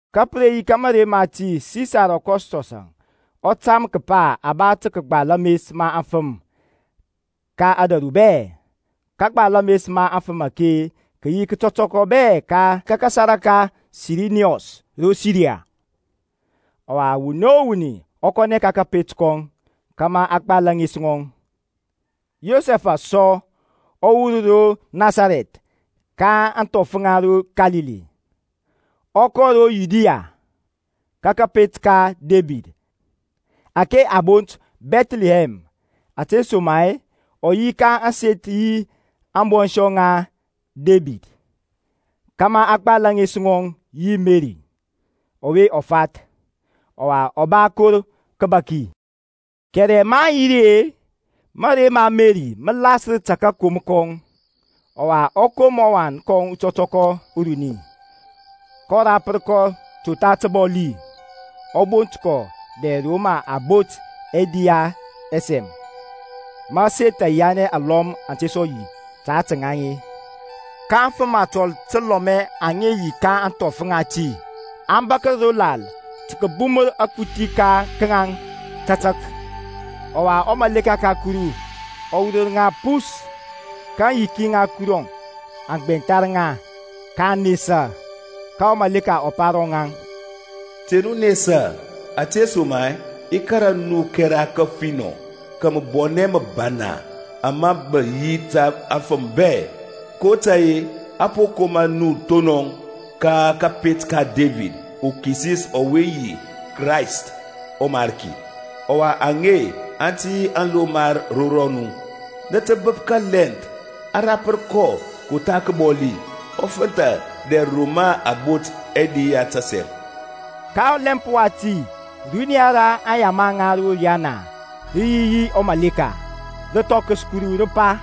Ka pə re yi ka mȧrey mati Sisar Akɔstɔs-əŋ ɔ tam kəpa a ba tə kəgbal ames ma aŋfəm ka ȧdȧru bɛ. Kagbal ames ma aŋfəm ake kə yi kətɔtɔkɔ bɛ ka kasara ka Siriniyɔs ro Siriya. Ɔwa wuni o wuni ɔ kɔnɛ ka kȧpet kɔŋ, kȧmȧ a gbal ȧŋes ŋɔŋ. Yosɛfȧŋ sɔ ɔ wur ro Nasarɛth ka ȧŋthɔf ŋa ro Kalili, ɔ kɔ ro Yudiya ka kȧpet ka Debid ȧke a bont Bɛthlihɛm, ȧtesoma-e ɔ yi ka ȧŋseth yi ȧŋbɔnshɔ ŋa Debid, kȧmȧ a gbal ȧŋes ŋɔŋ yi Meri ɔwe ɔ fath; ɔwa ɔ ba kor kəbaki. Kɛrɛ maŋ yi ri-e, mȧrey ma Meri mə lasər ta kȧkom kɔŋ. Ɔwa ɔ kom ɔwan kɔŋ utɔtɔkɔ uruni, kɔ rapər kɔ totha təbɔli, ɔ bot kɔ dɛr ro mə a bot ɛdi ya ɛsɛm, ma aseth ayiyanɛ alɔm aŋ te sɔ yi ta ȧtȧ ŋaŋ-e. Ka afəm atɔl təlɔmɛ aŋ yi ka ȧŋthɔf ŋati, aŋ bȧkər ro lal tə kəbumər akuthi ka ŋaŋ tȧtȧk. Ɔwa ɔmaleka ka Kuru ɔ wurər ŋa pus, ka aŋyiki ŋa Kuru aŋ gbɛnthar ŋa, kaŋ nesa. Ka ɔmaleka ɔ pa ro ŋaŋ, Te nu nesa, ȧtesoma-e i kȧrȧ nu kɛra kəfinɔ ka məbɔnɛ məbana, ama mə yi ta afəm bɛ. kotȧy-e a po koma nu thonɔŋ ka kȧpet ka Debid uKisis ɔwe yi Krayst ɔMarki. Ɔwa aŋe aŋ tə yi alomar ro rɔnu; nə tə bəp kalɛnth a rapər kɔ totha təbɔli, ɔ fənthȧ dɛr ro mə a bot ɛdi ya ɛsɛm. Ka ɔlɛmp wati runiya ra aŋyama ŋa ro riyana rə yi yi ɔmaleka, rə thɔkəs Kuru, rə pa,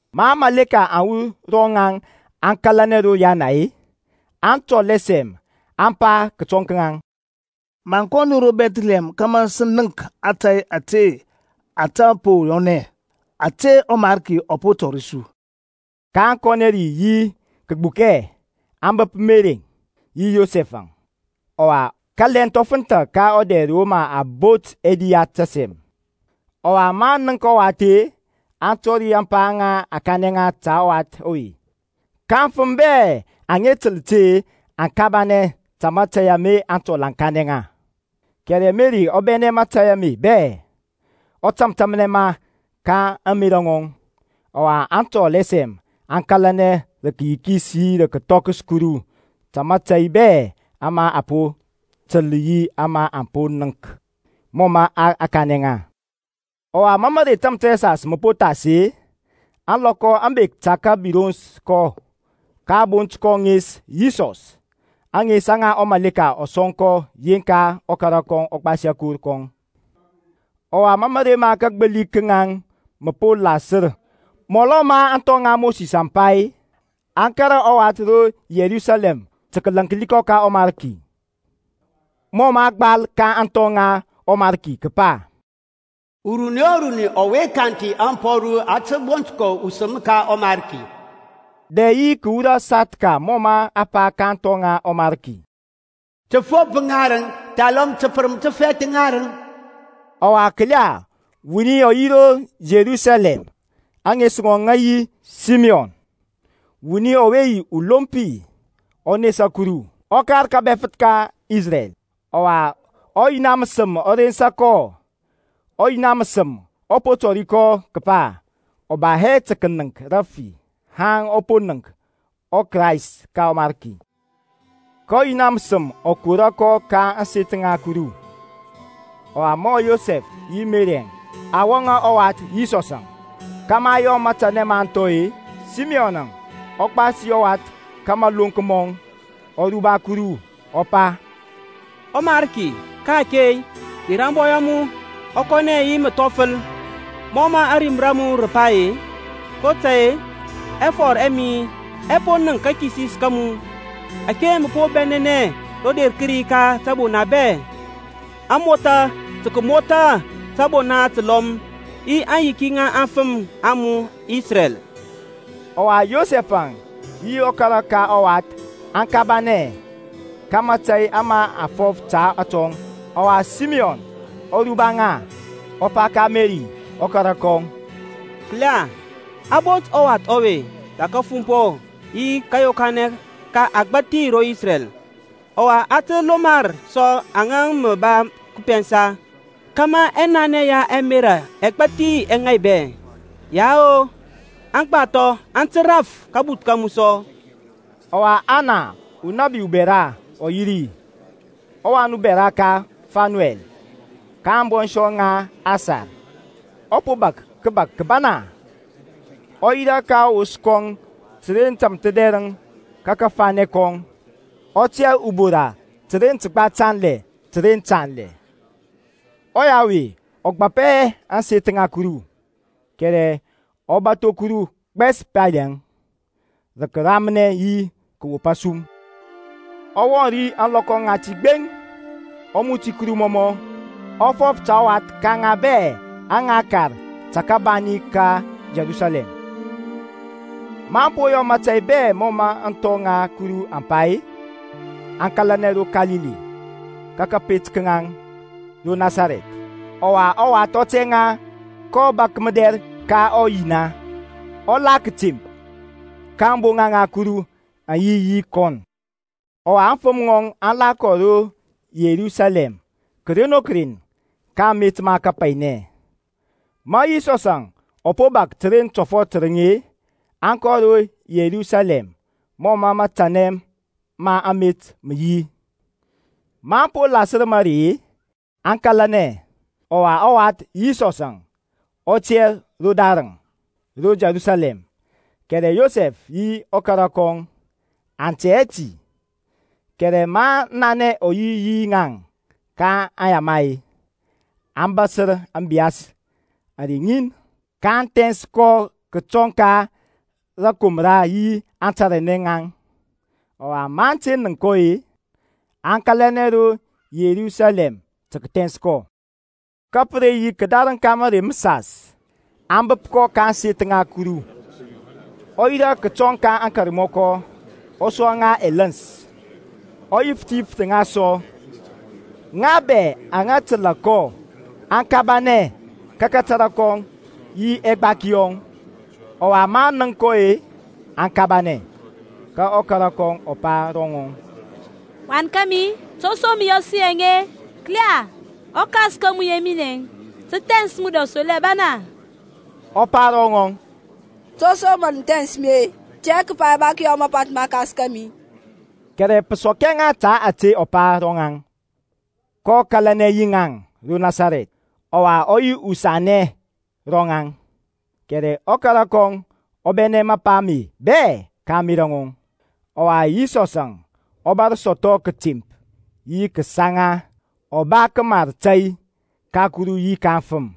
Ma aŋmȧleka aŋ wur ro ŋaŋ aŋ kȧlanɛ ro riana-e, aŋtɔl ɛsɛm aŋ pa kətɔŋ ka ŋaŋ, Maŋ kɔ nu ro Bɛthlihɛm kȧmȧ sə nənk ȧtȧy ȧte ȧtȧ po yɔnɛ, ȧte ɔMarki ɔ po tɔri su. kaŋ kɔnɛ ri yi kəgbukɛ, aŋ bəp Merɛŋ yi Yosɛf-əŋ, ɔwa kalɛnth ɔ fənthȧ ka ɔdɛr ro mə a bot ɛdi ya ɛsɛm. Ɔwa maŋ nənk ɔwath-e, aŋ tɔri ȧŋpa aŋa a kanɛ ŋa ta ɔwath ɔwe. Ka aŋfəm bɛ aŋa təl ti-e aŋ kabanɛ ta mȧtȧy ama aŋtɔl aŋ kanɛ ŋa. Kɛrɛ Merɛŋ ɔ bɛnɛ mȧtȧy ame bɛ-e, ɔ tȧmtȧmnɛ ma ka ȧŋmerȧ ŋɔŋ. Ɔwa aŋtɔl ɛsɛm aŋ kȧlanɛ rə kəyikis yi rə kəthɔkəs Kuru ta mȧtȧy bɛ ama aŋ po təl yi ama aŋ po nənk, mɔ mə a kanɛ ŋa. Ɔwa ma mərey tamthərɛsas mə po thas-e, ȧŋlɔkɔ aŋ bek tə kəbirons kɔ, ka a bont kɔ ŋes Yisɔs, ȧŋes aŋa ɔmaleka ɔ sɔŋ kɔ yeŋka ɔkara ɔ gbasi akor kɔŋ. Ɔwa ma mȧrey ma kagbili ka ŋaŋ mə po lasər mɔlɔ ma aŋthɔ ŋa Mosis aŋ pa, aŋ kȧrȧ ɔwath ro Yerusalɛm tə kəlaŋkli kɔ ka ɔMarki, (mɔ mə a gbal ka aŋthɔ ŋa ɔMarki kəpa, Uruni o runi ɔwe kanthi ȧŋpɔru a tə bont kɔ usəm ka ɔMarki), dɛ yi tə kəwura sathka mɔ mə a pa ka aŋthɔ ŋa ɔMarki, təfop ŋarəŋ, thalɔm təpərəm təfɛth ŋarəŋ. Ɔwa, kəla, wuni ɔ yi ro Yerusalɛm, ȧŋes ŋɔŋ ŋə yi Simiyɔn; wuni ɔwe yi ulompi, ɔ nesa Kuru, ɔ kar kȧbɛfəth ka Isrɛl. Ɔwa ɔYina məsəm ɔ rensa kɔ. Ɔyina məsəm ɔ po tɔri kɔ kəpa ɔ ba hɛ tə kənəŋk rəfi haŋ ɔ po nənk ɔKrayst ka ɔMarki. Ka ɔYina məsəm ɔ kora kɔ ka ȧŋseth ŋa Kuru; ɔwa ma Yosɛf yi Merɛŋ aŋ wɔŋȧ ɔwath Yisɔsȧŋ, kȧmȧ aŋ yɔ matanɛ ma aŋthɔ-e, Simiyɔn ɔ gbasi ɔwath ka maloŋk mɔŋ, ɔ ruba Kuru, ɔ pa, ƆMariki, ka-ake ter ȧŋbɔy a mu ɔ kɔnɛ yi məthɔfəl Mɔ mə ȧrim ra mu rə pa-e. kotȧy-e, ɛfɔr ɛ mi ɛ po nənk kakisis ka mu. Ȧke mə po bɛnɛnɛ roder kədi ka təbona bɛ; Amotha tə kəmotha tȧbona təlɔm Yi aŋyiki ŋa aŋfəm a mu Isrɛl. Ɔwa Yosɛf-əŋ yi ɔkara ka ɔwath aŋ kabanɛ ka mȧtȧy ama a fɔf ta atɔŋ. Ɔwa Simiyɔn ɔ ruba ŋa, ɔ pa ka Meri ɔkara kɔŋ, Kəla, a bot ɔwath ɔwe ta kafumpɔ yi kȧyokanɛ ka agbȧthi ro Isrɛl; ɔwa ta alomar sɔ aŋa mə a pɛnsa; kȧmȧ ɛnanɛ ya ɛmerȧ ɛgbathi ɛ ŋaibɛ. Yao, agbathɔ aŋ tə raf kabuth ka mu sɔ. Ɔwa Ana, unabi ubɛra ɔ yi ri, ɔwan bɛra ka Fanuɛl, ka ȧŋbɔnshɔ ŋa Asar; ɔ po bȧk kəbak kəbana, ɔ yirȧ ka ɔwos kɔŋ təren tȧmthədɛrəŋ ka kȧfanɛ kɔŋ. Ɔ tiyȧ ubora təren təgba tanlɛ təren tanlɛ. Ɔya ɔwe ɔ gbapɛ hɛ ȧŋseth ŋa Kuru, kɛrɛ ɔ bȧtho Kuru gbɛs pali-əŋ, rə kəramnɛ yi kəwop asum. Ɔ wɔŋ ri ȧŋlɔkɔ ŋati gbeŋ, ɔ muti Kuru mɔmɔ, ɔ fɔf ta ɔwath ka ŋa bɛ aŋa kar ta kabani ka Yerusalɛm. Maŋ po yɔ mȧtȧy bɛ mɔ mə aŋthɔ ŋa Kuru aŋ pa-e, aŋ kȧlanɛ ro Kalili, ka kȧpet ka ŋaŋ ro Nasarɛth. Ɔwa ɔwath ɔ tɛŋa, kɔ bȧk mədɛr ka ɔYina, ɔ la kətemp, ka ȧŋboŋa ŋa Kuru aŋ yi kɔ. Ɔwa aŋfəm ŋɔŋ aŋ la kɔ ro Yerusalɛm kəren o kəren ka amet ma kapainɛ. Ma Yisɔsȧŋ ɔ po bȧk təren tɔfɔt tərəŋ-e, aŋ kɔ ro Yerusalɛm mɔ matanɛ ma amet mə yi. Maŋ po lasər marey-e, aŋ kȧlanɛ, ɔwa ɔwath Yisɔsȧŋ ɔ tiyȧ rodarəŋ ro Yerusalɛm, kɛrɛ Yosɛf yi ɔkara kɔŋ aŋ tɛ hɛ ti; kɛrɛ maŋ nanɛ ɔ yi yi ŋaŋ ka aŋyama-e, aŋ bȧsər ȧŋbiyas ȧrey ŋin, kaŋ thɛns kɔ kətɔŋ ka rȧkomra yi antaranɛ ŋaŋ. Ɔwa maŋ te nənk kɔ-e, aŋ kȧlanɛ ro Yerusalɛm tə kəthɛns kɔ. Ka pə re yi kədareŋ ka mərey məsas aŋ bəp kɔ ka ȧŋseth ŋa Kuru, ɔ yirȧ kətɔŋ ka aŋkarmɔkɔ, ɔ sua ŋa ɛləns, ɔ yifəth yifəth ŋa sɔ. Ŋa bɛ aŋa təlȧ kɔ aŋ kabanɛ ka kȧtȧrȧ kɔŋ yi ɛgbaki yɔŋ. Ɔwa maŋ nənk kɔ-e, aŋ kabanɛ; ka ɔkara kɔŋ ɔ pa ro ŋɔŋ, Wan kȧmi, to som mɔ yɔ su yaŋ-e? Kəla, ɔkas ka mu yi minɛŋ, sə thɛns mu rə asoli abana. Ɔ pa ro ŋɔŋ, To som mə nə thɛns mi-e? Nə tɛ hɛ kəpa i ba kəyɔ mapanth ma ɔKas ka mi-i? Kɛrɛ pə sɔk hɛ ŋa ta ȧte ɔ pa ro rɔŋaŋ. kɔ kȧlanɛ yi ŋaŋ ro Nasarɛth, ɔwa ɔ yi usanɛ ro ŋaŋ, kɛrɛ ɔkara kɔŋ ɔ bɛnɛ mapa ame bɛ ka ȧŋmerȧ ŋɔŋ. Ɔwa Yisɔsȧŋ ɔ bȧr sɔthɔ kətemp yi kəsaŋa. Ɔ ba kəmar tȧy ka Kuru yi ka afəm.